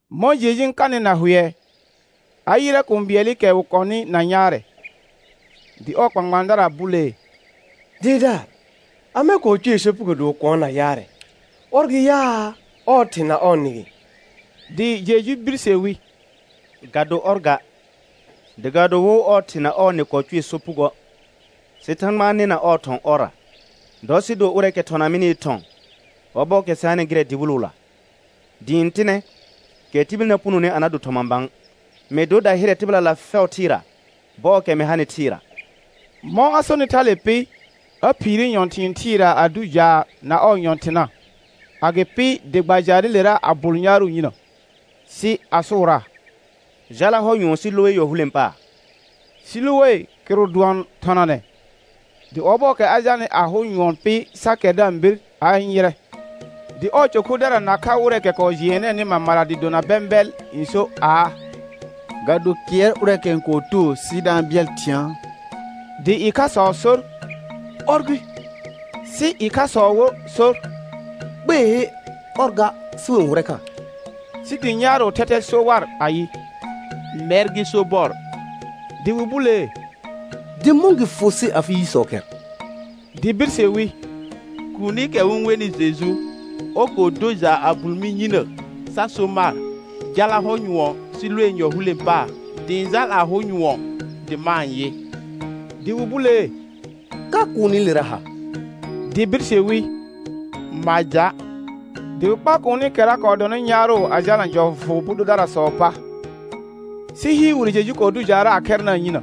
Mɔ̃ Jeju n kanɩ na hʋɛ, a yɩrɛ kũu bɩɛlɩkɛ wɩ kɔnɩ na yaarɛ. Dɩ ɔɔ kpãkpãadara bulee: Dɩɩrdaar, amɛ kɔɔ cʋɛ sopugo dɩ wɩ kʋ̃ɔ na yaarɛ, ɔr gɩ yaa, ɔɔ thɩ na ɔɔ nɩ gɩ? Dɩ Jeju birse wi: Ga do ɔr ga, dɩ ga do wo ɔɔ thɩ na ɔɔ nɩ kɔɔ cʋɛ sopugoə', sɩ Thãgba n nɩna ɔɔ thɔ̃ ɔrra. Dɔ sɩ do ʋrɛɛkɛ thɔna mɩnɩɩ thɔ̃ ɔbɔɔkɛ sɩ hanɩ gɩrɛ dɩwɩlʋla. Dɩɩ n tɩnɛ kɛ tibil na punoni a na do thɔma bã. Mɩ dor dahɩrɛ tɩbɩlala fɛʋ thɩɩra bɔɔkɛ mɩ hanɩ thɩɩra. Mɔ̃ a sonɩ thale pɩ, a phiire nyɔ̃thɩ̃ɩ thɩɩra a dʋ jaar na ɔɔ nyɔ̃thɩna. Agɩpɩ dɩ gba jaarɩlera a bʋl yaarʋ yinə, sɩ a sʋʋraa: Jala hɔ nyʋɔn Siloe yɔ hulẽ paar. Siloe kɩrʋ dʋɔn thɔnanɛ. Dɩ ɔbɔɔkɛ a jalnɩ a hʋ nyʋɔn pɩ sa kɛr da-n bir, a-n yɩrɛ. Dɩ ɔɔ cɔ khʋdara nakha wɩrɛɛkɛ kɔɔ jɩɛnɛɛnɩ mamara dɩ dona bɛ̃bɩɛl n sor aa: Ga do kɩɛr ʋrɛɛkɛ n kɔɔ too sɩ da-n bɩɛl thɩ̃aa? Dɩ ɩkhasɔ sor: Ɔr gɩ; sɩ ɩkhasɔ wo sor: Kpeehe, ɔr ga, sɩ wɩ-n hʋrɛ kha. Sɩ dɩ yaarʋʋ thɛthɛ so war ayɩ: Mɛr gɩ sobɔr. Dɩ wɩ bulee: Dɩ mɔ̃ gɩ fʋ sɩ afɩ yisɔ khɛr? Dɩ birse wi: Kuunikɛ wɩ-n wenɩ Jeju, ɔr kɔɔ do jaar a bʋl mɩ yinə sa so mar: Jala hɔ nyʋɔn Siloe yɔ hulẽ paar. Dɩ ɩ̃ jal a hʋ nyʋɔn, dɩ ma-n yɩ. Dɩ wɩ bulee: Ka kuunilera ha? Dɩ birse wi: Ma ja'. Dɩ wɩ kpa kuunikɛra kɔɔ dɔnɩ yaarʋ a jalna jɔfʋ bʋ dʋdarasɔɔ pa. Sɩ hɩɩr wire Jeju kɔɔ dʋ jaarra a khɛrnaa yinə.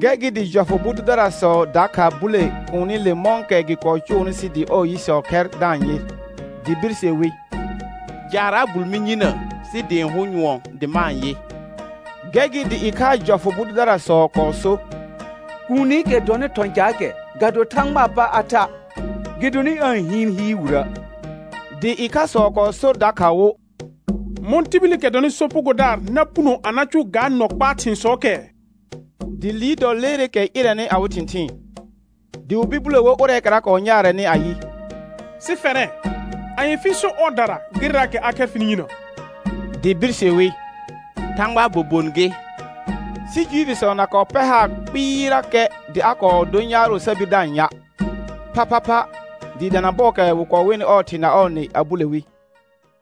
Gɛr gɩ dɩ jɔfʋ bʋ dʋdarasɔ dakha bule kuunile mɔ̃kɛ gɩ kɔɔ cʋʋnɩ sɩ dɩ ɔɔ yisɔ khɛr da-n yɩ. Dɩ birse wi: Jaar a bʋl mɩ yinə sɩ dɩ ɩ̃ hʋ nyʋɔn, dɩ ma-n yɩ. Gɛr gɩ dɩ ɩkhaa jɔfʋ bʋ dʋdarasɔ kɔɔ so: Kuunikɛ dɔnɩ thɔ̃ caakɛ ga do Thãgbaa pa a tha', gɩdonɩ aa-n hɩɩn hɩɩr wirə'. Dɩ ɩkhasɔ kɔɔ sor dakha wo: Mɔ̃ tibilikɛ dɔnɩ sopugodaar na puno a na cʋʋ ga nɔ kpaa thɩ̃sɔɔkɛ? Dɩ liir dɔ leereekɛ ɩrɛnɩ awɩ thɩ̃thɩɩn. Dɩ wɩ bir bule wo ʋrɛɛkɛra kɔɔ yaarɛnɩ ayɩ: Sɩ fɛrɛ, anye fɩ-n so ɔɔdara gɩrɛraakɛ a khɛr fɩnɩ yinə? Dɩ birse wi: Thãgbaa bobon gɩ. Sɩ Juifisɔ na kɔɔ pɛr haar kpɩɩrakɛ dɩ a kɔɔ dor yaarʋ sa bir da-n ya', phaphapha dɩɩ dana bɔɔkɛ wɩ wenɩ ɔɔ thɩ na ɔɔ nɩ, a bule wi: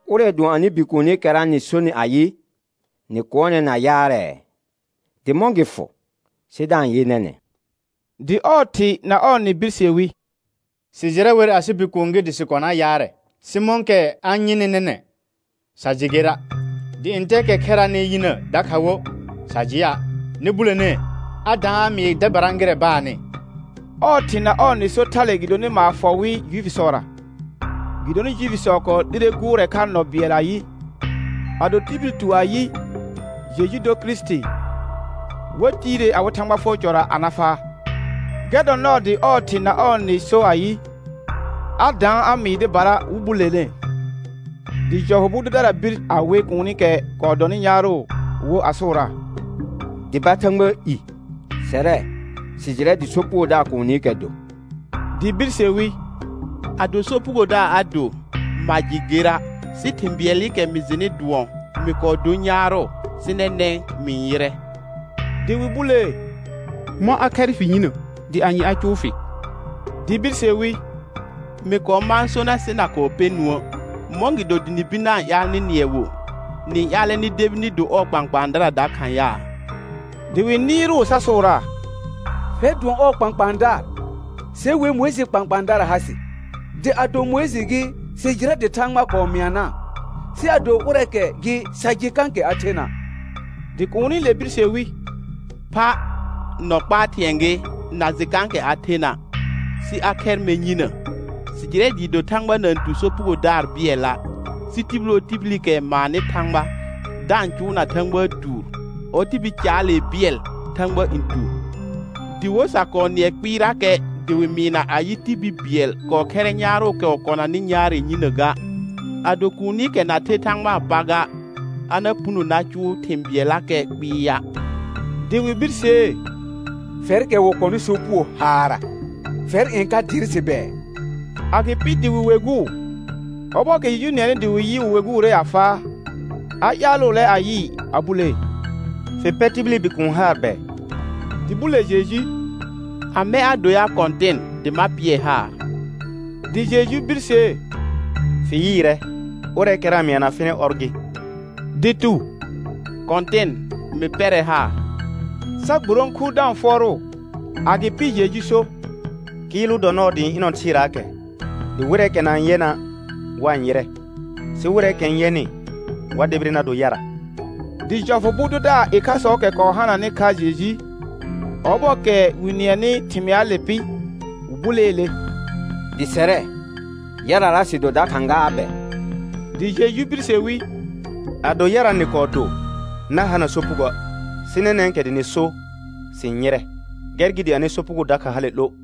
Ʋrɛ dʋɔn anɩ bikuunikɛra nɩ sonɩ ayɩ, nɩ kʋɔnɛ na yaarɛɛ? Dɩ mɔ̃ gɩ fʋ sɩ da-n yɩ nɛnɛ̃? Dɩ ɔɔ thɩ na ɔɔ nɩ birse wi: Sɩ jɩrɛ wer asɩ bikuun gɩ dɩ sɩ kɔnaa yaarɛ. Sɩ mɔ̃kɛ a-n yɩnɩ nɛnɛ̃, sa jɩ gera', dɩ ntɛɛkɛ khɛraanɩ yinə dakha wo, sa jɩa'. Nɩ bulenee, a daan a mɩɩ dɩbara gɩrɛ baannɩ. Ɔɔ thɩ na ɔɔ nɩ sor thale gɩdonɩ maar fɔ wɩ Juifisɔra, gɩdonɩ Juifisɔ kɔɔ 'lire gʋʋrɛ kha nɔ bɩɛl ayɩ: Ado tibil tu ayɩ, Jeju dor Kirisiti, wa tiire awɩ Thãgba fʋɔr cɔra a na faa. Gɛr dɔ nɔɔ dɩ ɔɔ thɩ na ɔɔ nɩ kɔɔ so ayɩ, a daan a mɩɩ dɩbara wɩ bulenee. Dɩ jɔfʋ bʋ dʋdara bir a we kuunikɛ kɔɔ dɔnɩ yaarʋ wo a sʋʋraa: Dʋba Thãgbaa i. Sɛrɛ, sɩ jɩrɛ dɩ sopugodaar kuunikɛ do. Dɩ birse wi: Ado sopugodaar a do, ma jɩ gera', sɩ thɩ̃ bɩɛlɩkɛ mɩ jɩnɩ dʋɔn: Mɩ kɔɔ dor yaarʋ, sɩ nɛnɛ̃ mɩ-n yɩrɛ. Dɩ wɩ bulee: Mɔ̃ a khɛr fɩ yinə, dɩ anye a cʋʋ fɩ? Dɩ birse wi: Mɩ kɔɔ mãa so nar sɩ na kɔɔ pɛ nũə'. Mɔ̃gɩdo dɩ nɩ bir na-n ƴaal nɩ nɩɛ wo? Nɩ-n ƴaalɛ nɩ debi nɩ do ɔɔ kpãkpãadara dakha yaa? Dɩ wɩ nɩɩrʋʋ sa sʋʋraa: Fɛr dʋɔn ɔɔ kpãkpãadaar, se wer Mʋɩjɩɩ kpãkpãadara ha sɩ. Dɩ ado Mʋɩjɩ gɩ, sɩ jɩrɛ dɩ Thãgba kɔɔ mɩanaa, sɩ ado ʋrɛɛkɛ gɩ sa jɩ kãkɛ a thena'. Dɩ kuunile birse wi: Pha, nɔ kpaa thɩ̃ɛ gɩ na jɩ kãkɛ a thena', sɩ a khɛr mɛr yinə. Sɩ jɩrɛ dɩɩ do Thãgba na-n tu sopugodaraa bɩɛla', sɩ tibil wo tibilikɛ n maannɩ Thãgba da-n cʋʋna Thãgbaa tuur, ɔ tibil caalee bɩɛl Thãgba n tu. Dɩ wo sa kɔɔ nɩɛ kpɩɩrakɛ dɩ wɩ mɩɩna ayɩ, tibil bɩɛl kɔɔ khɛrrɛ yaarʋʋkɛ wɩ kɔnanɩ yaarɛ yinə ga. Ado kuunikɛ na kɔɔ the Thãgbaa pa ga, a na puno na cuu thɩ̃ bɩɛllakɛ kpɩɩa'. Dɩ wɩ birsee: Fɛrkɛ wɩ kɔnɩ sopugo haarra, fɛr n ka dɩɩr sɩ bɛɛ? Agɩpɩ dɩ wɩ weguu. Ɔbɔɔkɛ Jeju nɩɛnɩ dɩ wɩ yɩ wɩ weguure a faa, a ƴaalʋʋlɛ a yɩɩ a bulee: Fɩ pɛr tibili Bikuun haar bɛ? Dɩ bule Jeju: Amɛ a do ya Kɔ̃tɩn dɩ ma pɩɛ haar? Dɩ Jeju birsee: Fɩ yɩɩrɛ, ʋrɛɛkɛra n mɩana fɩnɩ ɔr gɩ. Dɩ tu: Kɔ̃tɩn, mɩ pɛrɛ haar; sa gburõku da-n fʋɔrʋʋ. Agɩpɩ Jeju so: Kɩɩlʋ dɔ nɔɔ dɩ ɩ̃ ɩnɔ thɩɩraakɛ, dɩ wɩrɛɛkɛ na-n yɛna' wa-n yɩrɛ, sɩ wɩrɛɛkɛ n yɛnɩ wa debire na do yara. Dɩ jɔfʋ bʋ dʋdaar ɩkhasɔɔkɛ kɔɔ hananɩ kha Jeju, ɔbɔɔkɛ wɩ nɩɛnɩ thɩmɩaale pɩ, wɩ buleele: Dɩ sɛrɛ, yarara sɩ do dakha gaa bɛ? Dɩ Jeju birse wi: Ado yara nɩ kɔɔ do, na hana sopugoə', sɩ nɛnɛ̃kɛ dɩ nɩ so: Sɩ-n yɩrɛ; gɛr gɩ dɩ anɩ sopugo dakha hale 'lo.